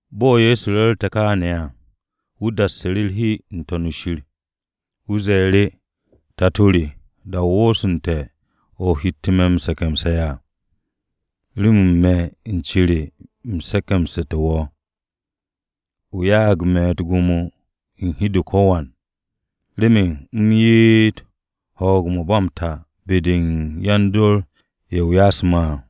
Bo̱ Ye̱so ru̱rte̱ kááne̱ à, wu̱ dassu̱ru̱ u̱r-hi n-To̱n shir. Wu̱ ze̱e̱ru̱, “Tato re, da-o wooste̱ o̱ o hette̱ me̱ m-se̱ke̱mse̱ à, remen me̱ u̱n cere u̱m se̱ke̱msu̱té̱ wo̱. O ya'ag me̱ u̱t-gwo̱mo u̱n hi-de u̱n ko̱wan, remen u̱m ye'et ho̱o̱g-o̱ ba m-ta be-de u̱n yan-dor-ye̱ o ya'asu̱ me̱ à.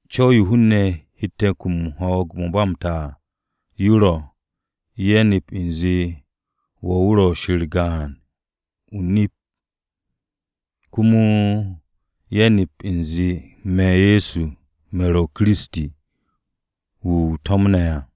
Co̱w-yo hun-ne̱ hette̱ m-kum ho̱o̱g-o̱ ba m-ta à, yo ro̱, ye̱ nep u̱nze wo̱ wu̱ ro̱ Shir gaan, o-nip, komo ye̱ nep u̱nze me̱, Ye̱so, me̱ ro̱ Kiristi, wu̱ o to̱mne̱ à.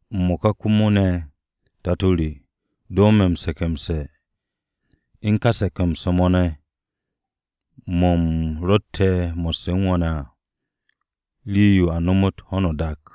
M-mo̱ka komo ne̱, Tato re, do me̱ m-se̱ke̱mse̱, u̱n ka se̱ke̱mse̱-mo̱ ne̱ mo̱ u̱m rotte̱ mo̱sse̱ u̱n wo̱ ne̱ à, rii-yo a nomot ho̱no o-dak.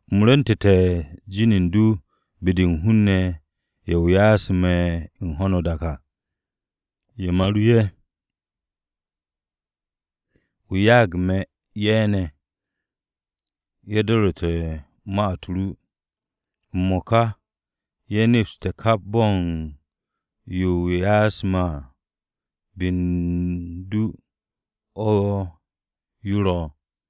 “U̱m rwu̱ntu̱te̱ jin u̱n du be-de u̱n hun-ne̱ ye̱ o ya'asu̱ me̱ u̱n ka ho̱no o-dak o̱ à. Ye̱ ma ru ye̱. O ya'ag me̱ ye̱ ne̱, ye̱ do̱ru̱te̱ ne̱ ma-u̱t ru. M-mo̱ka ye̱ nepste̱ kap bo̱ u̱n yo o ya'asu̱ me̱ à, be u̱n du o̱ yo ro̱.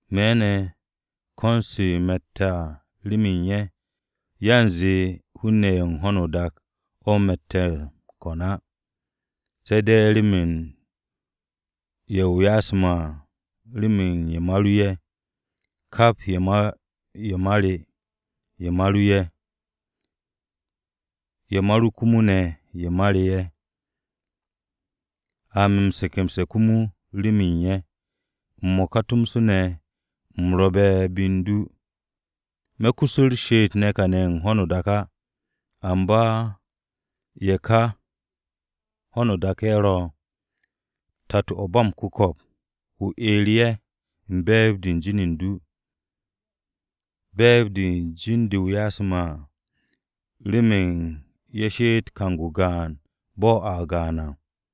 “Me̱ ne̱ ko̱n-se me̱tte̱ remen ye̱, yanze hun-ne̱ ye̱ u̱n ho̱no o-dak o̱ me̱ m-kone̱ á, se̱ de̱ remen ye̱ o ya'asu̱ me̱ à, remen ye̱ ma ru ye̱. Kap ye̱ ma re, ye̱ ma ru ye̱. Ye̱ ma ru komo ne̱ ye̱ ma re ye̱. A me̱ m-se̱ke̱mse̱ komo ne̱ remen ye̱. M-mo̱ka tomso ne̱ u̱m ro̱be̱ be u̱n du, me̱ kus u̱r-she'et ne̱ kane̱ ho̱no o-dak á. Amba ye̱ ka, ho̱no o-dak o̱ ye̱ ro̱. Tato-o̱ ba m-Ku̱ko̱p, o 'er ye̱ u̱n be̱e̱b-de u̱n jin u̱n du, be̱e̱b-de u̱n jin-de o ya'asu̱ me̱ à, remen ye̱ she'etté̱ kang-o gaan bo̱ a gaan à.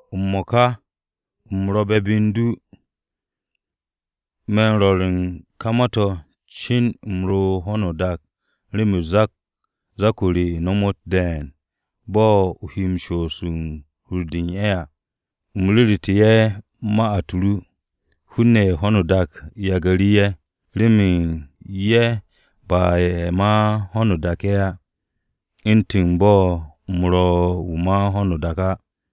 “M-mo̱ka, u̱m ro̱be̱ be u̱n du. Me̱n rwo̱r u̱n ka ma-to̱ cin u̱m ro̱ u̱n ho̱no o-dak remen zak-o re nomot de̱e̱n bo̱ o̱ he shoos u̱n hur-de u̱n ye̱ à. U̱m ru̱ru̱te̱ ye̱ ma-u̱t ru. Hun-ne̱ ye̱ u̱n ho̱no o-dak yagu̱ru̱ ye̱, remen ye̱ ba ye̱ ma ho̱no o-dak ye̱ á, u̱ntu̱n bo̱ u̱m ro̱ wu̱ ma ho̱no o-dak á.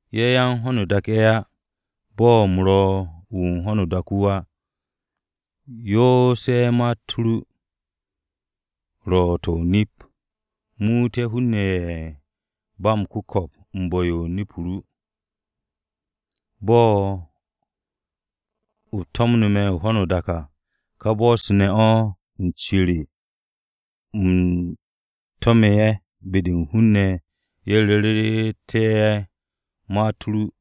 Ye̱, yan u̱n ho̱no o-dak ye̱ á, bo̱ u̱m ro̱ wu̱ u̱n ho̱no o-dak wu̱ á. Yoos ye̱ ma-u̱t ru, ro̱ to̱ nip-o̱. Muut ye̱ hun-ne̱ ye̱ ba m-ku̱ko̱p u̱n bu̱-yo u̱n nip-o ru. Bo̱ o to̱mnu̱ me̱ ho̱no o-dak à, ka bo̱-se ne̱ o̱, u̱n ce re, u̱m to̱me̱ ye̱ be-de u̱n hun-ne̱ ye̱ ru̱ru̱te̱ ye̱ ma-u̱t ru.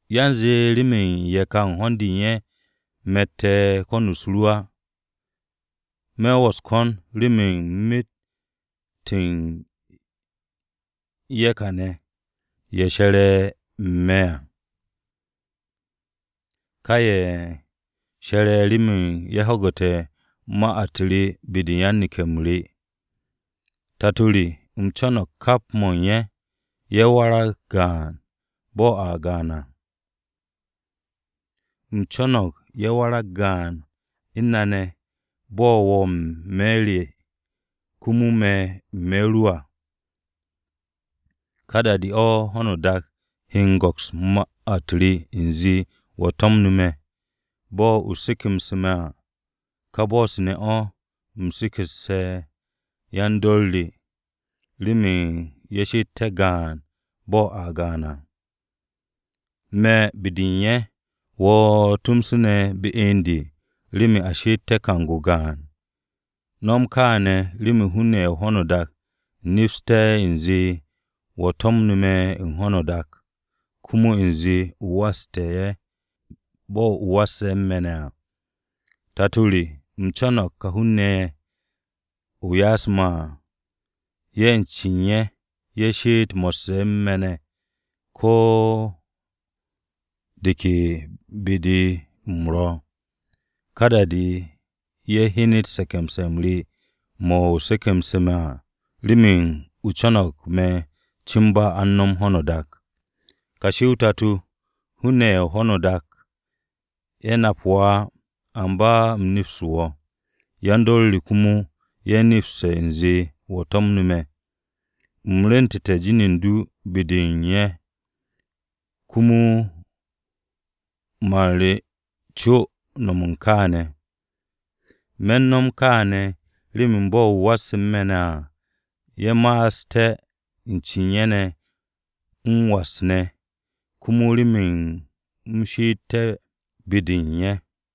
“Yanze remen ye̱ ka u̱n ho̱n-de u̱n ye̱ me̱tte̱ u̱n ko̱n-u̱s ru á. Me̱ wo̱ u̱s-ko̱n remen myet u̱n ye̱ ka ne̱, ye̱ she̱re̱ me̱ ne̱ à. Ka ye̱, she̱re̱ remen ye̱ ho̱gu̱te̱ ma-u̱t re be-de u̱n yan-neke̱-m re à. Tato re, u̱m co̱no̱g kap mo̱ u̱n ye̱, ye̱ warag gaan, bo̱ a gaan à. U̱m co̱no̱g ye̱ warag gaan u̱n na ne̱, bo̱ wo̱ n-me̱ re, komo me̱ n-me̱ ru à. Ka da-de o̱ ho̱no o-dak he m-go̱ks ma-u̱t re u̱nze wo̱ to̱mnu̱ me̱. Bo̱ o se̱ke̱mse̱ me̱ à, ka bo̱-se ne̱ o̱, u̱m se̱ke̱mse̱ yan-dor re, remen ye̱ she'etté̱ gaan bo̱ a gaan à. Me̱ be-de u̱n ye̱, wo̱ tomso ne̱ be u̱n de, remen a she'etté̱ kang-o gaan. No̱m kaane̱ remen hun-ne̱ ye̱ u̱n ho̱no o-dak nepsté̱ u̱nze wo̱ to̱mnu̱ me̱ u̱n ho̱no o-dak, komo u̱nze o wastu̱ ye̱ bo̱ o wasse̱ u̱n me̱ ne̱ à. “Tato re, u̱m co̱no̱g ka hun-ne̱ ye̱ o ya'asu̱ me̱ à, ye̱ u̱n cen ye̱, ye̱ she'et mo̱sse̱ u̱n me̱ ne̱ ko̱ de ke be-de u̱m ro̱. Ka da-de ye̱ hyenet se̱ke̱mse̱-m re mo̱ o se̱ke̱mse̱ me̱ à, remen o co̱no̱g me̱ cin ba a u̱n no̱m ho̱no o-dak. “Kashi o-Tato, hun-ne̱ ye̱ u̱n ho̱no o-dak, ye̱ nap wo̱ á, amba u̱m nepste̱ wo̱. Yan-dor re komo, ye̱ nepste̱ u̱nze wo̱ to̱mnu̱ me̱. U̱m rwu̱ntu̱te̱ jin u̱n du be-de u̱n ye̱, komo man re co m-no̱m kááne̱. Me̱n no̱m kááne̱ remen bo̱ o wasse̱ u̱n me̱ ne̱ à, ye̱ ma'asté̱, u̱n cen ye̱ ne̱, m-was ne̱, komo remen u̱m she'etté̱ be-de u̱n ye̱.”